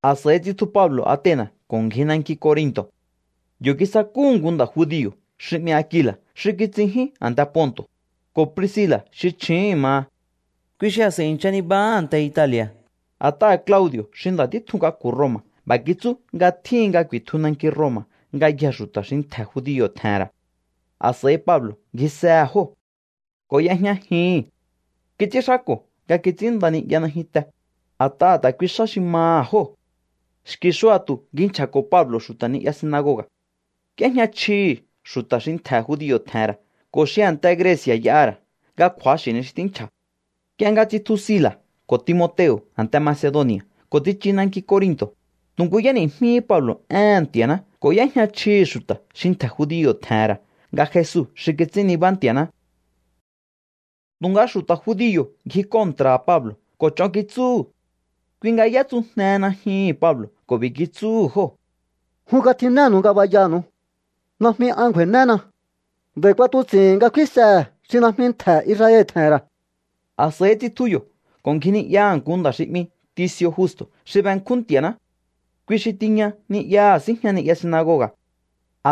A̱s'a̱i tsitju Pablo̱ Atena̱ ko̱ ngji nanki Corinto̱. Yo̱ kisakúhu̱ nku nda̱ judio̱ xi 'mi Akila̱ xi kitsinjín a̱nte Ponto̱, ko̱ Priscila̱ xi chju̱úhu̱n maha. Kui xi a̱s'a̱i i̱ncha nibahá a̱nte Itali̱a̱, a̱t'aha̱ Claudi̱o̱ xi nda̱ títjun k'aku̱ Roma̱ b'a̱ kitsú nga tjíhin nga ku̱i̱tju nanki Roma̱ ngayjee̱ xu̱ta̱ xi ntje̱ judio̱ tje̱he̱n ra̱. A̱s'a̱i Pablo̱ ngjisehe̱ jóo̱ ko̱ y'ejñajihi̱n. Kits'ínxáko̱ nga kits'ínnda ni'ya najyunte, a̱t'aha̱ ta̱ kuihi xá xi maha̱ jóo̱. Xki̱ xua̱tu̱ ngji nchja̱ko̱ Pablo̱ xu̱ta̱ ni'ya sinagoga̱. Y'éjña chjihi̱ xu̱ta̱ xi ntje̱ judio̱ tje̱he̱n ra̱ ko̱ xi a̱nte Greci̱a̱ y'aha̱ ra̱ nga kju̱axi̱ ni xi tínchja̱. Nk'ie nga tsitju Sila̱ ko̱ Timoteo̱ a̱nte Macedoni̱a̱ ko̱ tsichu nanki Corinto̱, tu̱ nku y'éni̱jmíhí Pablo̱ éhe̱n Nti̱a̱ná ko̱ y'éjña chjihi̱ xu̱ta̱ xi ntje̱ judio̱ tje̱he̱n ra̱ nga Jesu xi kits'ín nibá Nti̱a̱ná. Tu̱nga xu̱ta̱ judio̱ ngji kontra̱ha̱ Pablo̱ ko̱ ch'on kitsúhu̱. Kui nga y'étsujnehe najyuhu̱n Pablo̱ ko̱ b'i̱ kitsúhu̱ jóo̱: —Jun katjinénu̱u ngabayanu̱u. Najmi an ngju̱a̱i̱néna. Nd'a̱i̱ k'uatuts'i̱hi̱n nga kfínsehe̱ xi najmi ntje̱ Israel tje̱he̱n ra̱. A̱s'a̱i tsitju yo̱ ko̱ ngji ni'yaha̱ nku nda̱ xi 'mi Tici̱o̱ Justo̱ xi benkjún Nti̱a̱ná. Kui xi tiña ni'yaha̱ síjña ni'ya sinagoga̱.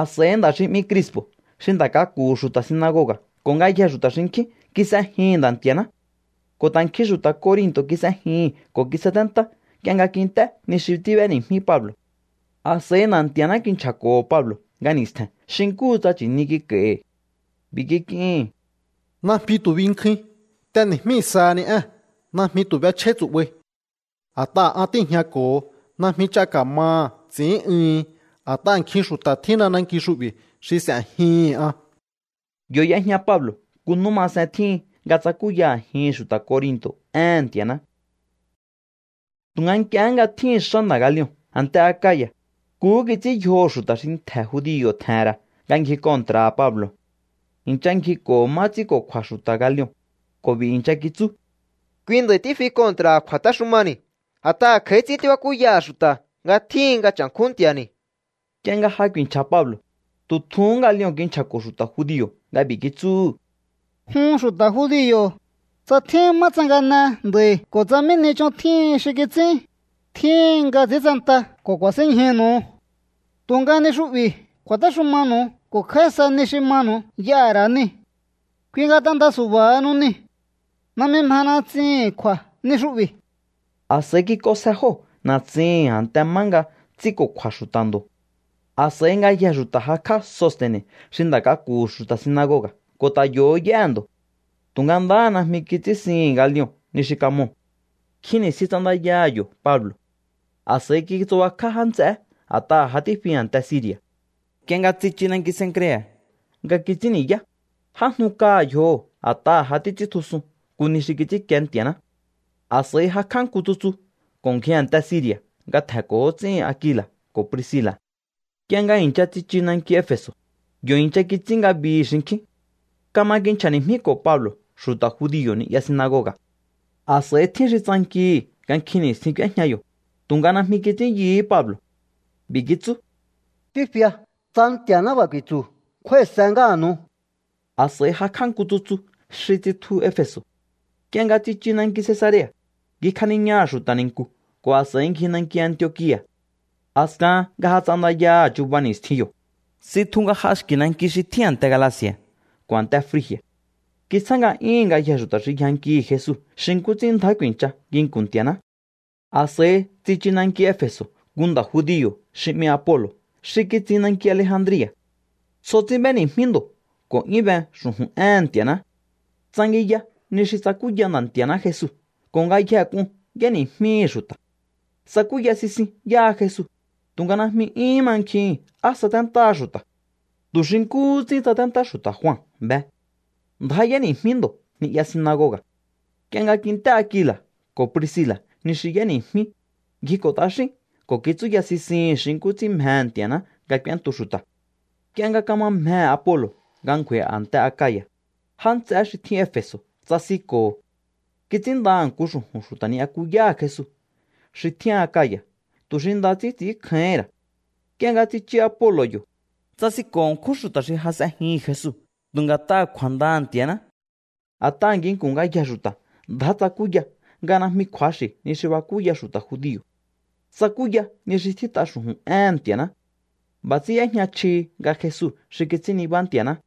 A̱s'a̱i nda̱ xi 'mi Crispo̱ xi nda̱ k'aku̱hu̱ xu̱ta̱ sinagoga̱ ko̱ ngayjee̱ xu̱ta̱ xinkjín kis'ejihi̱n Nda̱ Nti̱a̱ná. Ko̱ ta̱ nkjin xu̱ta̱ Corinto̱ kis'ejihi̱n ko̱ kisaténtá nk'ie nga kint'é ni xi tíb'éni̱jmí Pablo̱. A̱s'a̱i Nda̱ Nti̱a̱ná kinchja̱ko̱ho̱ Pablo̱ nga ni̱stje̱n xi nkúhu tsa nchi̱ni kik'a̱i̱hi̱. B'i̱ kik'ihi̱n: —Najmi tu̱ binkjuin. T'eni̱jmí sahani ée̱n. Najmi tu̱ b'echjáí tsu̱'bai. A̱t'aha̱ an tíi̱jñako̱ho. Najmi ch'a ka̱maha̱ ts'i̱ín'uhin. A̱t'aha̱ nkjin xu̱ta̱ tjínna nanki xu'bi̱ xi s'e̱jihi̱n an. Yo̱ y'ejña Pablo̱ nku nú masen tjíhin nga tsakúya a̱jihi̱n xu̱ta̱ Corinto̱ éhe̱n Nti̱a̱ná. Tu̱nga nk'ie nga tjíhi̱n xá nda̱ Galion a̱nte Akaya̱, nkuhú kits'ín yjoho̱ xu̱ta̱ xi ntje̱ judio̱ tje̱he̱n ra̱ nga ngji kontra̱ha̱ Pablo̱. I̱ncha ngjiko̱ho̱ má ts'ínko̱kju̱a̱ xu̱ta̱ Galion ko̱ b'i̱ i̱ncha kitsú: —Kui nda̱i̱ tífi kontra̱ha̱ kju̱a̱téxumani̱, a̱t'aha̱ kj'a̱í ts'ín tíbakúyaha̱ xu̱ta̱ nga tjíhin nga cha̱nkjún Nti̱a̱ni̱. Nk'ie nga ja ku̱i̱nchja̱ Pablo̱, tu̱ tjuhún Galion kinchja̱ko̱ xu̱ta̱ judio̱ nga b'i̱ kitsúhu̱: —Jun xu̱ta̱ judio̱, tsa tjín má tsangane nda̱i̱ ko̱ tsa mí ni ch'on tjíhin xi kits'ín, tjíhin nga ts'intsenta ko̱ kuasinñjúnu̱u. Tu̱nga ni xu'bi̱ kju̱a̱téxumanu̱u ko̱ kj'a̱í sa ni xi manu̱u y'aha̱ ra̱ nii̱. Kui nga t'enda su̱ba̱hanu niu̱. Najmi mjena ts'ihi̱n kju̱a̱ ni xu'bi̱. A̱s'a̱i kik'onsje jóo̱ na̱tsihi̱n a̱nte má nga ts'ínko̱kju̱a̱ xu̱ta̱ ndo̱. A̱s'a̱i ngayjee̱ xu̱ta̱ jakj'á Soste̱ne̱ xi nda̱ k'aku̱hu̱ xu̱ta̱ sinagoga̱ ko̱ ta̱ yo̱hó y'éhe̱ ndo̱. Tu̱nga ndaha najmi kits'ínsihi̱n Galion ni xi kamoo̱. Nkjin ni̱stjin ts'andaya yo̱ Pablo̱. A̱s'a̱i kitsubakjá já nts'eé a̱t'aha̱ ja tífi a̱nte Siri̱a̱. Nk'ie nga tsichu nanki Cencrea̱ nga kits'ín ni̱yá, j'ájnu kaha̱ yjoho̱ a̱t'aha̱ ja títs'íntjusun nku ni xi kits'ínkie Nti̱a̱ná. A̱s'a̱i jakj'á nku tsutsu ko̱ ngji a̱nte Siri̱a̱ nga tje̱nko̱ ts'íhin Akila̱ ko̱ Priscila̱. Nk'ie nga i̱ncha tsichu nanki Efe̱so̱, yo̱ i̱ncha kits'ín ngabihi̱ xinkjín. Kama kinchja̱ni̱jmíko̱ Pablo̱ xu̱ta̱ judio̱ ni'ya sinagoga̱. A̱s'a̱i tjín xi tsankihi̱ nga nkjin ni̱stjin k'úéjña yo̱, tu̱nga najmi kits'ín yuhú Pablo̱. B'i̱ kitsú: —Tífia. Tsa Nti̱a̱ná b'a̱ ku̱i̱tsu̱, kjúái̱se ngáha̱nu̱u. A̱s'a̱i jakj'á nku tsutsu xi tsitju Efe̱so̱. Nk'ie nga tsichu nanki Cesarea̱, ngjikjaniñaha̱ xu̱ta̱ ni̱nku̱ ko̱ a̱s'a̱i ngji nanki Antiokia̱. A̱skahan nga ja ts'andayaha̱ chuba ni̱stjin yo̱, tsitju nga j'a xki̱ nanki xi tjín a̱nte Galaci̱a̱ ko̱ a̱nte Frigi̱a̱. Kitsjá nga'yúhu̱n ngayjee̱ xu̱ta̱ xi yjankihi̱ Jesu xi nkú ts'ín ndjá ku̱i̱ncha nginku̱n Nti̱a̱ná. A̱s'a̱i tsichu nanki Efe̱so̱ nku nda̱ judio̱ xi 'mi Apolo̱ xi kitsin nanki Alejandria̱. Tsjo ts'ín b'éni̱jmí ndo̱ ko̱ 'yún be xu̱ju̱n éhe̱n Nti̱a̱ná. Tsangiya ni xi tsakúya Nda̱ Nti̱a̱ná Jesu ko̱ ngayjehe k'un y'éni̱jmíhi̱ xu̱ta̱. Tsakúya sisin yáha Jesu, tu̱nga najmi 'yúhún mankjihi̱n á saténtáha xu̱ta̱. Tu̱ xi nkúhú ts'ín tsaténtá xu̱ta̱ Jua be. Ndjá y'éni̱jmí ndo̱ ni'ya sinagoga̱. Nk'ie nga kint'é Akila̱ ko̱ Priscila̱ ni xi y'éni̱jmí, ngjiko̱ t'axín ko̱ kitsúya sisihi̱n xi nkú ts'ín mjehe̱ Nti̱a̱ná nga k'úéntu xu̱ta̱. Nk'ie nga kama mjehe̱ Apolo̱ nga ngju̱a̱i̱ a̱nte Akaya̱, já nts'eé xi tjín Efe̱so̱ tsasinko̱ho̱. Kits'ínndaha̱ nku xu̱ju̱n xu̱ta̱ ni'yakuyáha̱ Jesu xi tjín Akaya̱ tu̱ xi nda ts'ín ts'i̱ínkjáíhi̱n ra̱. Nk'ie nga tsichu Apolo̱ yo̱, tsasinko̱ ṉkjún xu̱ta̱ xi ja s'ejihi̱n Jesu tu̱ nga̱t'aha̱ kju̱a̱ndaha̱ Nti̱a̱ná. A̱t'aha̱ nginku̱n ngayjee̱ xu̱ta̱ ndjá tsakúya nga najmi kju̱axi̱ ni xi bakúya xu̱ta̱ judio̱. Tsakúya ni xi tjít'a xu̱ju̱n éhe̱n Nti̱a̱ná. B'a̱ ts'ín y'éjña chjihi nga Jesu xi kits'ín nibá Nti̱a̱ná.